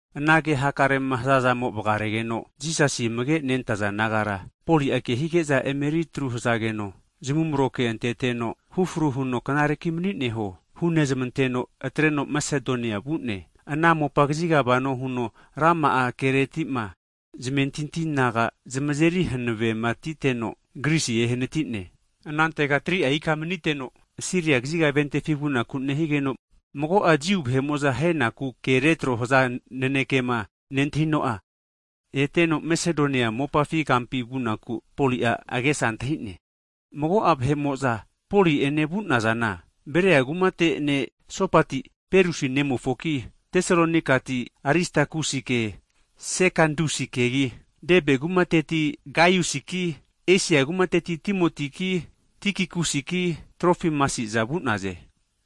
Ana ke hakarema haza'zamo vgaregeno, Jisasi amage nentaza disaipol nagara Poli'a kehige'za emeritru hazageno, zamumro kea anteteno, hufru huno knareki manineho hunezmanteno, atreno Masedonia vu'ne. Ana mopa kazigama vano huno rama'a keretima zamentinti naga zamazeri hanavematiteno, Grisi ehanati'ne. Anantega 3'a ika maniteno, Siria kaziga ventefi vunaku'ma nehigeno, mago'a Jiu vahe'mo'za haenaku ke retro haza nanekema nentahino'a, eteno Masedonia mopafi kampi vunaku Poli'a agesa antahi'ne. Mago'a vahe'mo'za Poli'ene vu'nazana, Beria kumateti ne' Sopati, Perusi nemofoki, Tesalonikati Aristakusi'ene Sekanduskegi, Debe kumateti Gaiusiki, Esia kumateti Timotiki, Tikikusiki, Trofimasi'za vu'naze.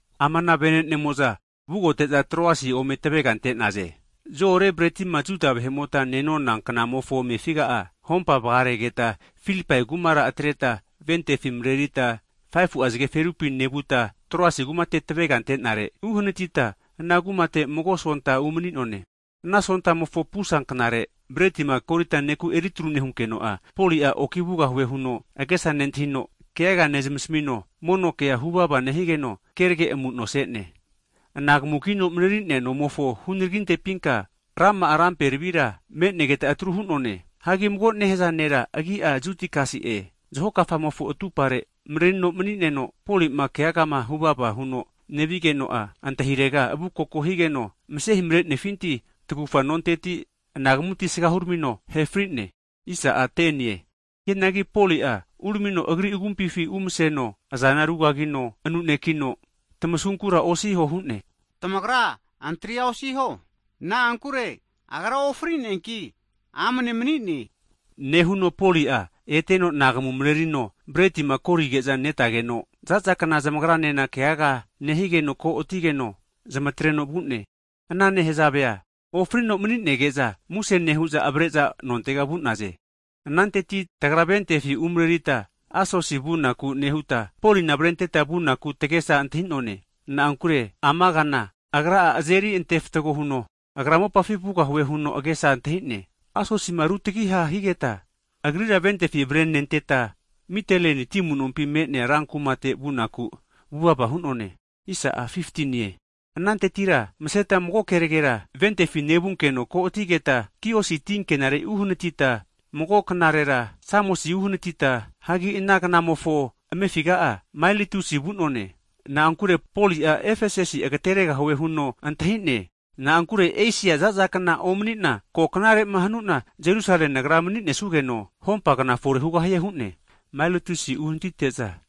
Ama ana vene'nemo'za vugote'za Troasi ome tavega ante'naze. Zo'ore bretima Juda vahe'mota nenona kna'mofo amefiga'a hompama vagaregeta, Filipai kumara atreta ventefi mrerita 5fu'a zge ferupi nevuta, Troasi kumate tavega ante'nare uhnatita ana kumate mago sonta umani'none. Ana Sontamofo pusa kna're bretima kori'za (komonion) neku eritruma nehunkeno'a, Poli'a oki vugahue huno agesa nentahi'no keaga nezmasmino, mono kea huvava nehigeno kerage amu'no ase'ne. Anagamu kino mareri'nea nomofo hunaraginte pinka rama'a rampe tvira manenegeta atrua hu'none. Hagi mago nehaza nera agi'a Jutikasi'e, zaho kamofo atupare (windo) marerino mani'neno, Poli'ma keagama huvava huno nevigeno'a, antahirega avukoko higeno, mase himarenefinti, tagufa nonteti anagamuti asaga huramino ahe fri'ne. Hianagi Poli'a uramino agri agumpi umseno azana rugagino anu'nekino tmasunkura osiho hu'ne. Tamagra antria osiho, na'ankure agra ofri'neanki amne mani'ne huno hu'ne. Nehuno Poli'a eteno anagamu marerino, bretima korige'za netageno, za'za kna zamagranena keaga nehigeno ko'atigeno zamatreno vu'ne. Ana nehazavea ofrino mani'nege'za muse nehu'za avare'za nontega vu'naze. Ananteti tagra ventefi umarerita Asosi vunaku nehuta, Polina avarenteta vunaku tagesa antahi'none, na'ankure ama kana agra'a azeri antefatgo huno, agra mopafi vugahue huno agesa antahi'ne. Asosima rutagiha higeta, agrira ventefi avarenentata, Miteleni ti amunompi me'nea ran kumate vunaku vuvava hu'none. Anantetira maseta mago knarera ventefi nevunkeno ko'atigeta, Kiosi tinkenare uhanatita, mago knarera Samosi uhanatita, hagi ana kna'mofo amefiga'a Mailitusi vu'none. Na'ankure Poli'a Efesasia agateregahue huno antahi'ne, na'ankure Esia za'za kna omani'na ko knare'ma hanuna Jerusale nagra mani'nesugeno hompa (pentikos) kna fore hugahie hu'ne. Mailatusi uhanatite'za,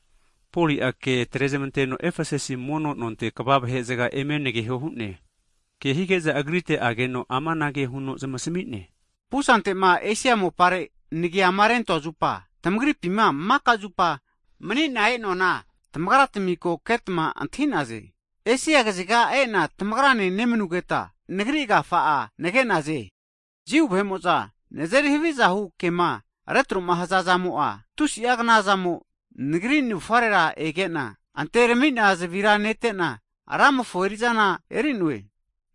Poli'a ke atrezmanteno Efesasi mono nonte kva (elda) vahe'zga eme nageho hu'ne. Ke hige'za agrite ageno, amanage huno zamasmi'ne, Pusante'ma Esia mopare nagiama rentoa zupa, tamagripima maka zupa mani'na e'noana, tamagratmi ko ketma antahi'naze. Esia kaziga e'na tamagrane nemanugeta nagri agafa'a nage'naze. Jiu vahe'mo'za nazeri havizahu kema retro'ma haza zamo'a tusi'a knazamo nagri navufare ege'na anterami'na zavira nete'na, Ramofo erizana eri'noe.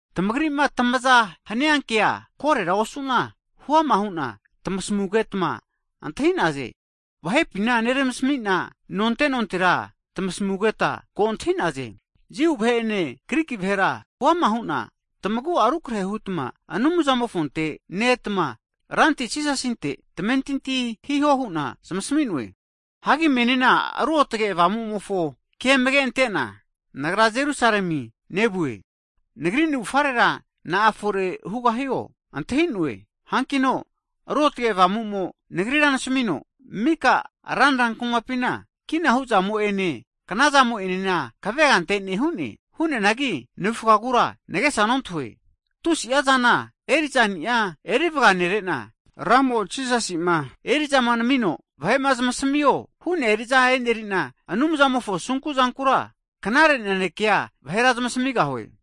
Tamagri'ma tamaza hania kea, korera osu'na huama hu'na tamasmugetma antahi'naze. Vahe'pina neramasmi'na, nonte nontera tamasmugetma ko antahi'naze. Jiu vahe'ene Griki vahera hu'ama hu'na tamagu'a rukarehe hutma Anumzante ne-etma, Ranti Jisasinte tamentinti hiho hu'na zamasmi'noe. Hagi menina Ruotge Avamu'mofo ke amage antena, nagra Jerusalemi nevue, nagri navufarera na'a fore hugahio, ontahi'noe. Hankino Ruotge Avamu'mo nagrira nasamino, mika ranra kumapina, kina hu'zamo'ene kna'zamo'enena kavega ante'ne hu'ne. Hu'neanagi navufagura nagesa nontahue, tusi'a zana eri'zani'a erivaga nere'na, Ra Jisasi'ma eri'zama namino vahe'ma zamasmio hu'nea eri'za eri'na Anumzamofo asunku zankura knare nanekea vahera zamasmigahue.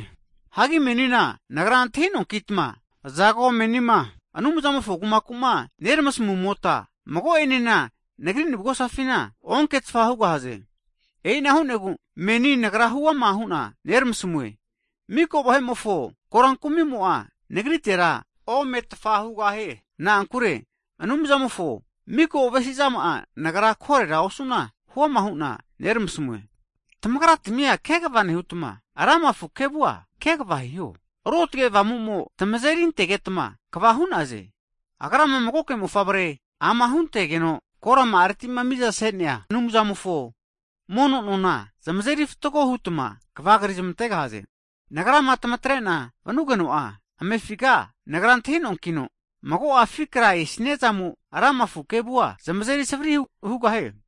Hagi menina nagra antahi'noankitma, azago menima Anumzamofo kumakuma neramasmumota, mago'enena nagri navugosafina onke'tfa hugahaze. E'ina hu'negu, meni nagra huama hu'na neramasmue, miko vahe'mofo koran kumimo'a nagritera ome'tfa hugahie. Na'ankure Anumzamofo miko avesi'zama'a nagra korera osu'na hu'ama hu'na neramasmue. Tamagratmia kegva nehutma, lama afu kevua kegva hiho, Ruotge Avamu'mo tamazeri antegetma kva hu'naze. Agrama magoke Mofavre ama huntegeno koranteti'ma mizama ase'nea Anumzamofo mono nagara zamazeri fatgo hutma kavagri zamantegahaze. Nagrama tamatrena vanugeno'a amefiga, nagra antahi'noankino, mago'a afi' kra esaniazamo lama afu kevua zamazeri savri hugahie.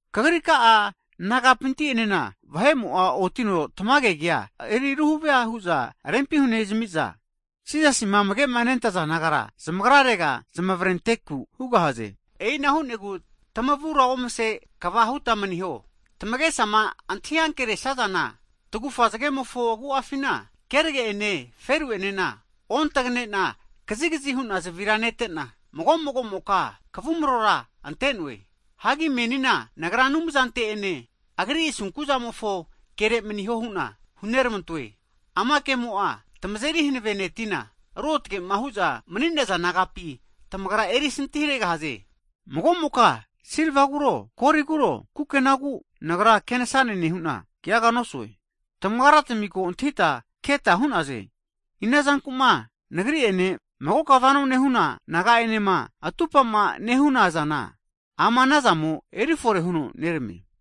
Kagri ka'a nagapinti enena vahe'mo'a otino tamage kea eri ruvahe hu'za rempi hunezmi'za, Jisasima amage' nentaza disaipol nagara zamagrarega zamavrenteku hugahaze. E'ina hu'negu tamavura omase kava hute maniho, tamagesama antahi ankeresazana tagufa zagegfumofo agu'afina hanine zgenena ontagane'na kazigzi hu'na zavira nete'na, mago'mago'moka kavumarora ante'noe. Hagi menina nagra Anumzante'ene, Agri asunku'zamofo kere maniho hu'na huneramantoe. Ama kemo'a tamazeri hanave netina, ruotage'ma hu'za mani'naza nagapi tamagra erisanti haregahaze. Mago'moka silvaguro, Goliguro, kukenagu nagra kenasane nehu'na keaga nosue. Tamagratmi ko antahita keta hu'naze, ina zanku'ma nagri'ene, magoka vano nehuna naga'enema atupa'ma nehunazana, ama anazamo erifore huno neramie.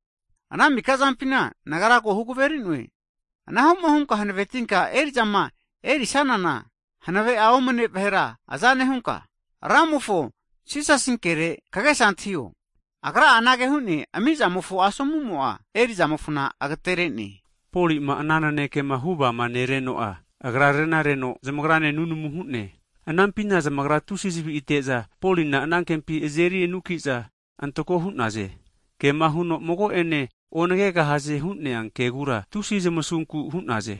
Ana mika zampina nagra ko hugaveri'noe, anahu'ma hunka hanavetinka eri'zama erisanana, hanave'a omane vahera aza nehunka, Ramofo Jisasinkere kagesa antahio, Agra'a anage hu'ne, ami'zamofo asomumo'a, eri'zamofona agatere'ne hu'ne. Poli'ma ana nanekema huvama nereno'a, agra renareno zamagrane nunamu hu'ne. Anampina zamagra tusi zavi'ateza Polina anankempi azeri anuki'za antako hu'naze. Kema huno mago'ene onagegahaze hu'nea kegura, tusi zamasunku hu'naze.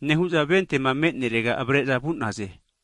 Nehu'za ventema me'nerega avare'za vu'naze.